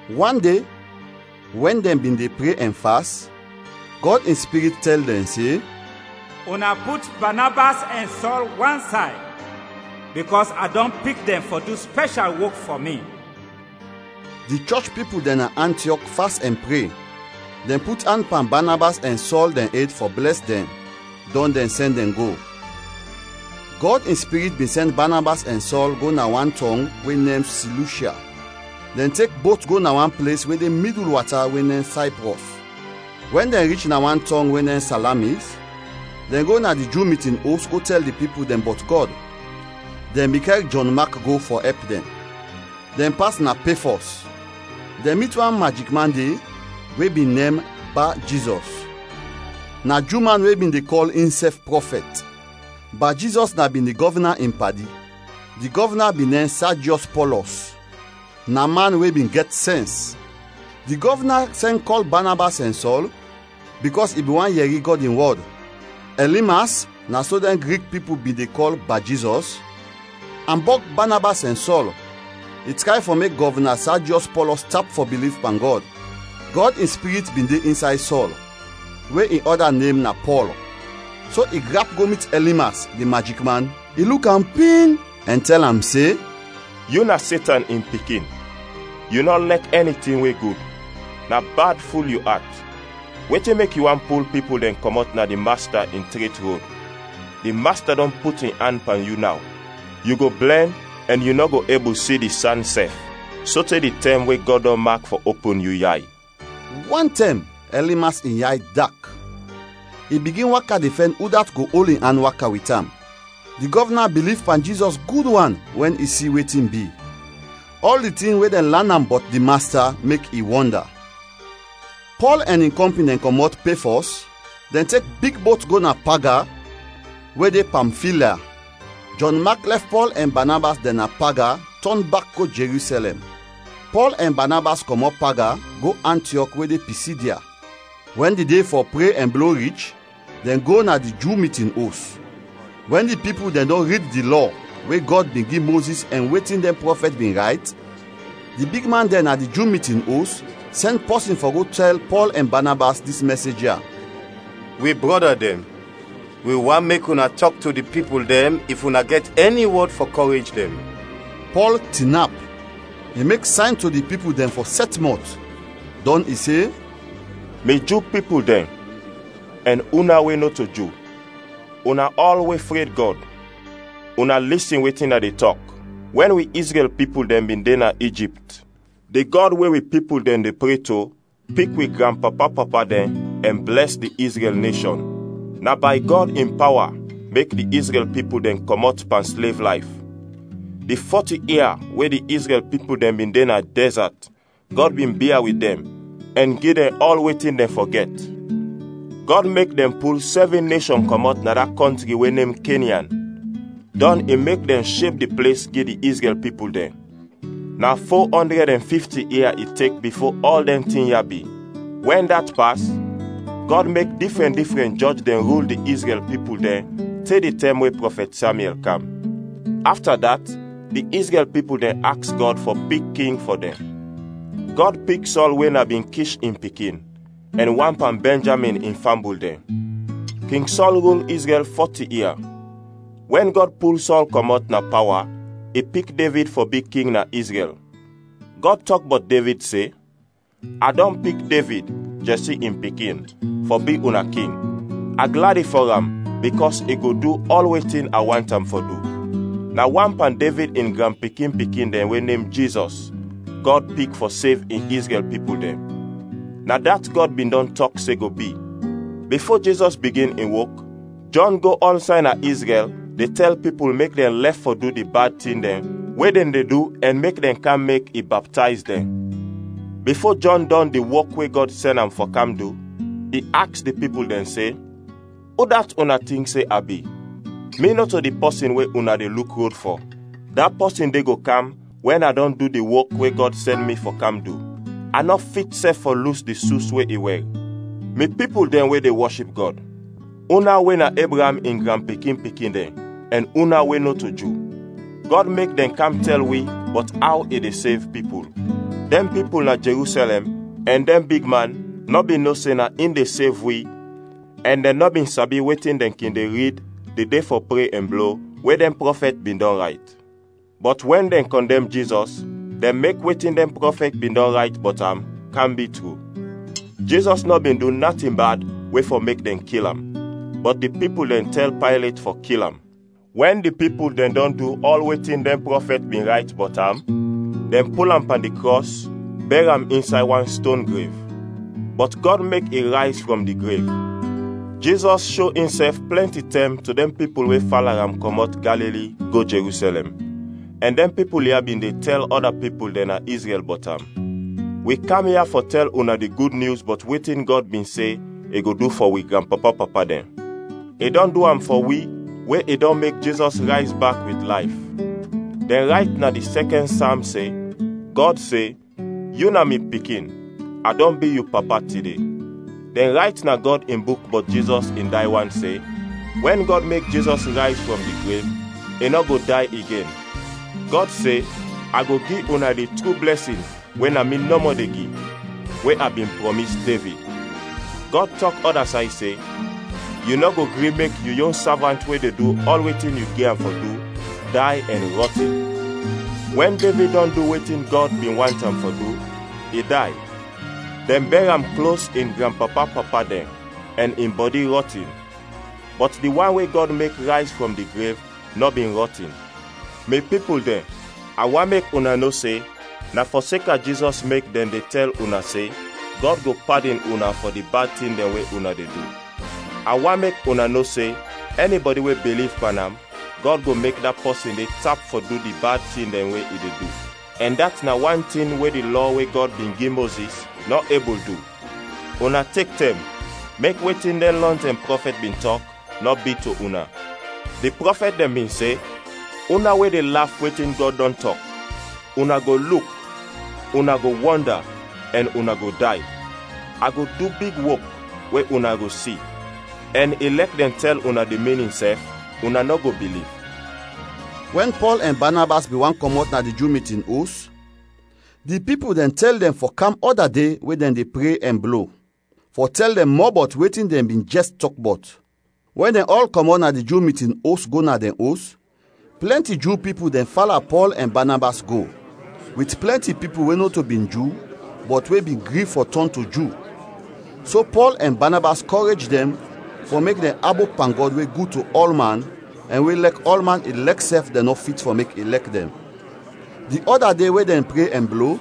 Wan de wɛn dɛn bin de pre ɛn fas, Gɔd in Spirit tɛl dɛn se, “Una put Banabas ɛn Sɔl wansay bikɔs a dɔn pik dɛn fɔ du spɛshal wok fɔ mi.” Di chɔch pipul dɛn na Antiɔk fas ɛn pre. Dɛn put an pan Banabas ɛn Sɔl dɛn ed fɔ blɛs dɛn, dɔn dɛn sɛn dɛn go. Gɔd in Spirit bin sɛn Banabas ɛn Sɔl go na wan tɔng we nem Silushya. Dɛn tek bot go na wan ples we de midul wata we nem Sayprɔs. Wɛn dɛn rich na wan tɔng we nem Salamis, dɛn go na di Ju mitin os go tɛl di pipul dɛn bɔt Gɔd. Dɛn bin kɛr Jɔn Mak go fɔ ɛp dɛn. Dɛn pas na Pefɔs; dɛn mit wan majikman de we bin nem Ba-Jizɔs. Na Ju man we bin de kɔl insɛf prɔfɛt. Ba-Jizɔs na bin di gɔvna in padi. Di gɔvna bin nem Sajiɔs Pɔlɔs, na man we bin gɛt sɛns. Di gɔvna sɛn kɔl Banabas ɛn Sɔl, bikɔs i bin want yɛri Gɔd in wɔd. Ɛlimas (na so dɛn Grik pipul bin de kɔl Ba-Jizɔs) ambɔg Banabas ɛn Sɔl. I tray fɔ mek Gɔvna Sajiɔs Pɔlɔs tap fɔ biliv pan Gɔd. Gɔd in Spirit bin de insay Sɔl, we in ɔda nem na Pɔl, so i grap go mit Ɛlimas, di majikman; i luk am ping, ɛn tɛl am se, “Yu na Setan in pikin, yu nɔ lɛk ɛni tin we gud. Na bad ful yu at. Wetin mek yu want pul pipul dɛn kɔmɔt na di Masta in tret rod? Di Masta dɔn put in an pan yu naw; yu go blɛn ɛn yu nɔ go ebul si di san sɛf sote di tɛm we Gɔd dɔn mak fɔ opin yu yay.” Wantɛm Ɛlimas in yay dak, i bigin waka de fɛn udat go ol in an waka wit am. Di gɔvna biliv pan Jizɔs gud wan wɛn i si wetin bi. Ɔl di tin we dɛn lan am bɔt di Masta mek i wɔnda. Pɔl ɛn in kɔmpin dɛn kɔmɔt Pefɔs, dɛn tek big bot go na Paga we de Pamfilya. Jɔn Mak lɛf Pɔl ɛn Banabas dɛn na Paga tɔn bak go Jerusɛlɛm. Pɔl ɛn Banabas kɔmɔt Paga, go Antiɔk we de Pisidya. Wɛn di de fɔ pre ɛn blo rich, dɛn go na di Ju mitin os. Wɛn di pipul dɛn dɔn rid di Lɔ we Gɔd bin gi Mozis ɛn wetin dɛn prɔfɛt bin rayt, di bigman dɛn na di Ju mitin os sɛn pɔsin fɔ go tɛl Pɔl ɛn Banabas dis mɛsej ya: “Wi brɔda dɛn, wi want mek una tɔk to di pipul dɛn if una gɛt ɛni wɔd fɔ kɔrej dɛn.” Pɔl tinap; i mek sayn to di pipul dɛn fɔ sɛt mɔt, dɔn i se, “Mi Ju pipul dɛn ɛn una we nɔto Ju, una ɔl we fred Gɔd; una lisin wetin a de tɔk! Wɛn wi Izrɛl pipul dɛn bin de na Ijipt, di Gɔd we wi pipul dɛn de pre to pik wi granpapa-papa dɛn ɛn blɛs di Izrɛl neshɔn. Na bay Gɔd in pawa mek di Izrɛl pipul dɛn kɔmɔt pan slev layf. Di fɔti ia we di Izrɛl pipul dɛn bin de na dɛzat, Gɔd bin bia wit dɛn ɛn gi dɛn ɔl wetin dɛn fɔ gɛt. Gɔd mek dɛn pul sɛvin neshɔn kɔmɔt na da kɔntri we nem Kenyan, dɔn i mek dɛn sheb di ples gi di Izrɛl pipul dɛn. Na fo ɔndrɛd ɛn fifti ia i tek bifo ɔl dɛn tin ya bi. “Wɛn dat pas, Gɔd mek difrɛn difrɛn jɔj dɛn rul di Izrɛl pipul dɛn te di tɛm we prɔfɛt Samyɛl kam. Afta dat, di Izrɛl pipul dɛn aks Gɔd fɔ pik king fɔ dɛn. Gɔd pik Sɔl we na bin Kish in pikin, ɛn wan pan Bɛnjamin in fambul dɛn. King Sɔl rul Izrɛl fɔti ia. Wɛn Gɔd pul Sɔl kɔmɔt na pawa, i pik Devid fɔ bi king na Izrɛl. Gɔd tɔk bɔt Devid se, ‘A dɔn pik Devid, Jɛsi in pikin, fɔ bi una king; a gladi fɔ am bikɔs i go du ɔl wetin a want am fɔ du.’ Na wan pan Devid in granpikin-pikin dɛn we nem Jizɔs, Gɔd pik fɔ sev in Izrɛl pipul dɛn. Na dat Gɔd bin dɔn tɔk se go bi. Bifo Jizɔs bigin in wok, Jɔn go ɔlsay na Izrɛl de tɛl pipul mek dɛn lɛf fɔ du di bad tin dɛn we dɛn de du ɛn mek dɛn kam mek i baptayz dɛn. Bifo Jɔn dɔn di wok we Gɔd sɛn am fɔ kam du, i aks di pipul dɛn se, ‘Udat una tink se a bi? Mi nɔto di pɔsin we una de luk rod fɔ. Da pɔsin de go kam wɛn a dɔn du di wok we Gɔd sɛn mi fɔ kam du. A nɔ fit sɛf fɔ lus di sus we i wɛr.’ “Mi pipul dɛn we de wɔship Gɔd, una we na Ebraam in granpikin-pikin dɛn ɛn una we nɔto Ju; Gɔd mek dɛn kam tɛl wi bɔt aw i de sev pipul. Dɛn pipul na Jerusɛlɛm ɛn dɛn bigman nɔ bin no se na in de sev wi ɛn dɛn nɔ bin sabi wetin dɛn kin de rid di de fɔ pre ɛn blo, we dɛn prɔfɛt bin dɔn rayt. Bɔt wɛn dɛn kɔndɛm Jizɔs, dɛn mek wetin dɛn prɔfɛt bin dɔn rayt bɔt am kam bi tru. Jizɔs nɔ bin du natin bad we fɔ mek dɛn kil am, bɔt di pipul dɛn tɛl Paylet fɔ kil am. Wɛn di pipul dɛn dɔn du ɔl wetin dɛn prɔfɛt bin rayt bɔt am, dɛn pul am pan di krɔs, bɛr am insay wan ston grev. Bɔt Gɔd mek i rayz frɔm di grev. Jizɔs sho insɛf plɛnti tɛm to dɛn pipul we fala am kɔmɔt Galili go Jerusɛlɛm, ɛn dɛn pipul ya bin de tɛl ɔda pipul dɛn na Izrɛl bɔt am. Wi kam ya fɔ tɛl una di Gud Nyus bɔt wetin Gɔd bin se i go du fɔ wi granpapa-papa dɛn. I dɔn du am fɔ wi we i dɔn mek Jizɔs rayz bak wit layf. Dɛn rayt na di sɛkɛn Sam se, Gɔd se, ‘Yu na mi Pikin; a dɔn bi yu Papa tide.’ Dɛn rayt na Gɔd in Buk bɔt Jizɔs in day wan se, wɛn Gɔd mek Jizɔs rayz frɔm di grev, i nɔ go day igen. Gɔd se, ‘A go gi una di tru blɛsin we na mi nɔmɔ de gi, we a bin prɔmis Devid.’ Gɔd tɔk ɔda say se, ‘Yu nɔ go gri mek yu yon savant we de du ɔl wetin yu gi am fɔ du day ɛn rɔtin.’ Wɛn Devid dɔn du wetin Gɔd bin want am fɔ du, i day. Dɛn bɛr am klos in granpapa-papa dɛn ɛn in bɔdi rɔtin. Bɔt di wan we Gɔd mek rayz frɔm di grev nɔ bin rɔtin. Mi pipul dɛn, a want mek una no se na fɔseka Jizɔs mek dɛn de tɛl una se Gɔd go padin una fɔ di bad tin dɛn we una de du. A want mek una no se ɛnibɔdi we biliv pan am, Gɔd go mek da pɔsin de tap fɔ du di bad tin dɛn we i de du, ɛn dat na wan tin we di Lɔ we Gɔd bin gi Mozis nɔ ebul du. Una tek tɛm, mek wetin dɛn lɔntɛm prɔfɛt bin tɔk, nɔ bi to una. Di prɔfɛt dɛn bin se, ‘Una we de laf wetin Gɔd dɔn tɔk, una go luk, una go wɔnda, ɛn una go day! A go du big wok we una go si, ɛn ilɛk dɛn tɛl una di minin sɛf, una nɔ go biliv.’” Wɛn Pɔl ɛn Banabas bin want kɔmɔt na di Ju mitin os, di pipul dɛn tɛl dɛn fɔ kam ɔda de we dɛn de pre ɛn blo, fɔ tɛl dɛn mɔ bɔt wetin dɛn bin jɛs tɔk bɔt. Wɛn dɛn ɔl kɔmɔt na di Ju mitin os go na dɛn os, plɛnti Ju pipul dɛn fala Pɔl ɛn Banabas go, wit plɛnti pipul we nɔto bin Ju bɔt we bin gri fɔ tɔn to Ju. So Pɔl ɛn Banabas kɔrej dɛn fɔ mek dɛn abop pan Gɔd we gud to ɔlman ɛn we lɛk ɔlman ilɛk sɛf dɛn nɔ fit fɔ mek i lɛk dɛn. Di ɔda de we dɛn pre ɛn blo,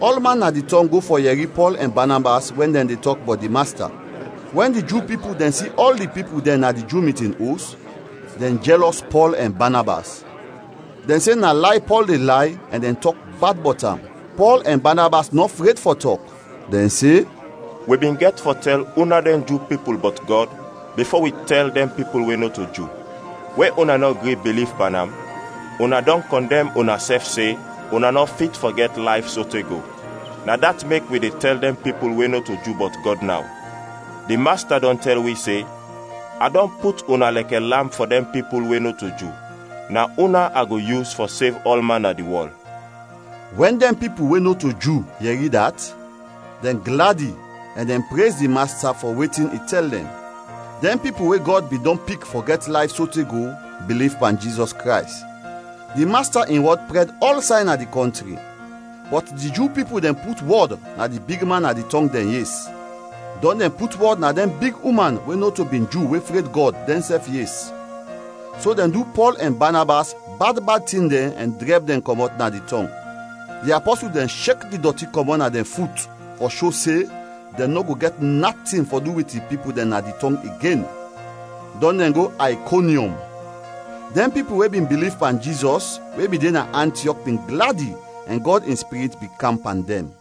ɔlman na di tɔng go fɔ yɛri Pɔl ɛn Banabas wɛn dɛn de tɔk bɔt di Masta. Wɛn di Ju pipul dɛn si ɔl di pipul dɛn na di Ju mitin os, dɛn jɛlɔs Pɔl ɛn Banabas. Dɛn se na lay Pɔl de lay ɛn dɛn tɔk bad bɔt am. Pɔl ɛn Banabas nɔ fred fɔ tɔk; dɛn se, “Wi bin gɛt fɔ tɛl una dɛn Ju pipul bɔt Gɔd bifo wi tɛl dɛn pipul we nɔto Ju. We una nɔ gri biliv pan am, una dɔn kɔndɛm unasɛf se una nɔ fit fɔ gɛt layf sote go. Na dat mek wi de tɛl dɛn pipul we nɔto Ju bɔt Gɔd naw. Di Masta dɔn tɛl wi se, ‘A dɔn put una lɛkɛ lamp fɔ dɛn pipul we nɔto Ju. Na una a go yus fɔ sev ɔlman na di wɔl.’” Wɛn dɛn pipul we nɔto Ju yɛri dat, dɛn gladi ɛn dɛn prez di Masta fɔ wetin i tɛl dɛn. Dɛn pipul we Gɔd bin dɔn pik fɔ gɛt layf sote go, biliv pan Jizɔs Krays. Di Masta in wɔd prɛd ɔlsay na di kɔntri. Bɔt di Ju pipul dɛn put wɔd na di bigman na di tɔng dɛn yes, dɔn dɛn put wɔd na dɛn big uman we nɔto bin Ju we fred Gɔd, dɛnsɛf yes. So dɛn du Pɔl ɛn Banabas bad bad tin dɛn ɛn drɛb dɛn kɔmɔt na di tɔng. Di apɔsul dɛn shek di dɔti kɔmɔt na dɛn fut fɔ sho se dɛn nɔ go gɛt natin fɔ du wit di pipul dɛn na di tɔng igen, dɔn dɛn go Aykonyɔm. Dɛn pipul we bin biliv pan Jizɔs we bin de na Antiɔk bin gladi ɛn Gɔd in Spirit bin kam pan dɛn.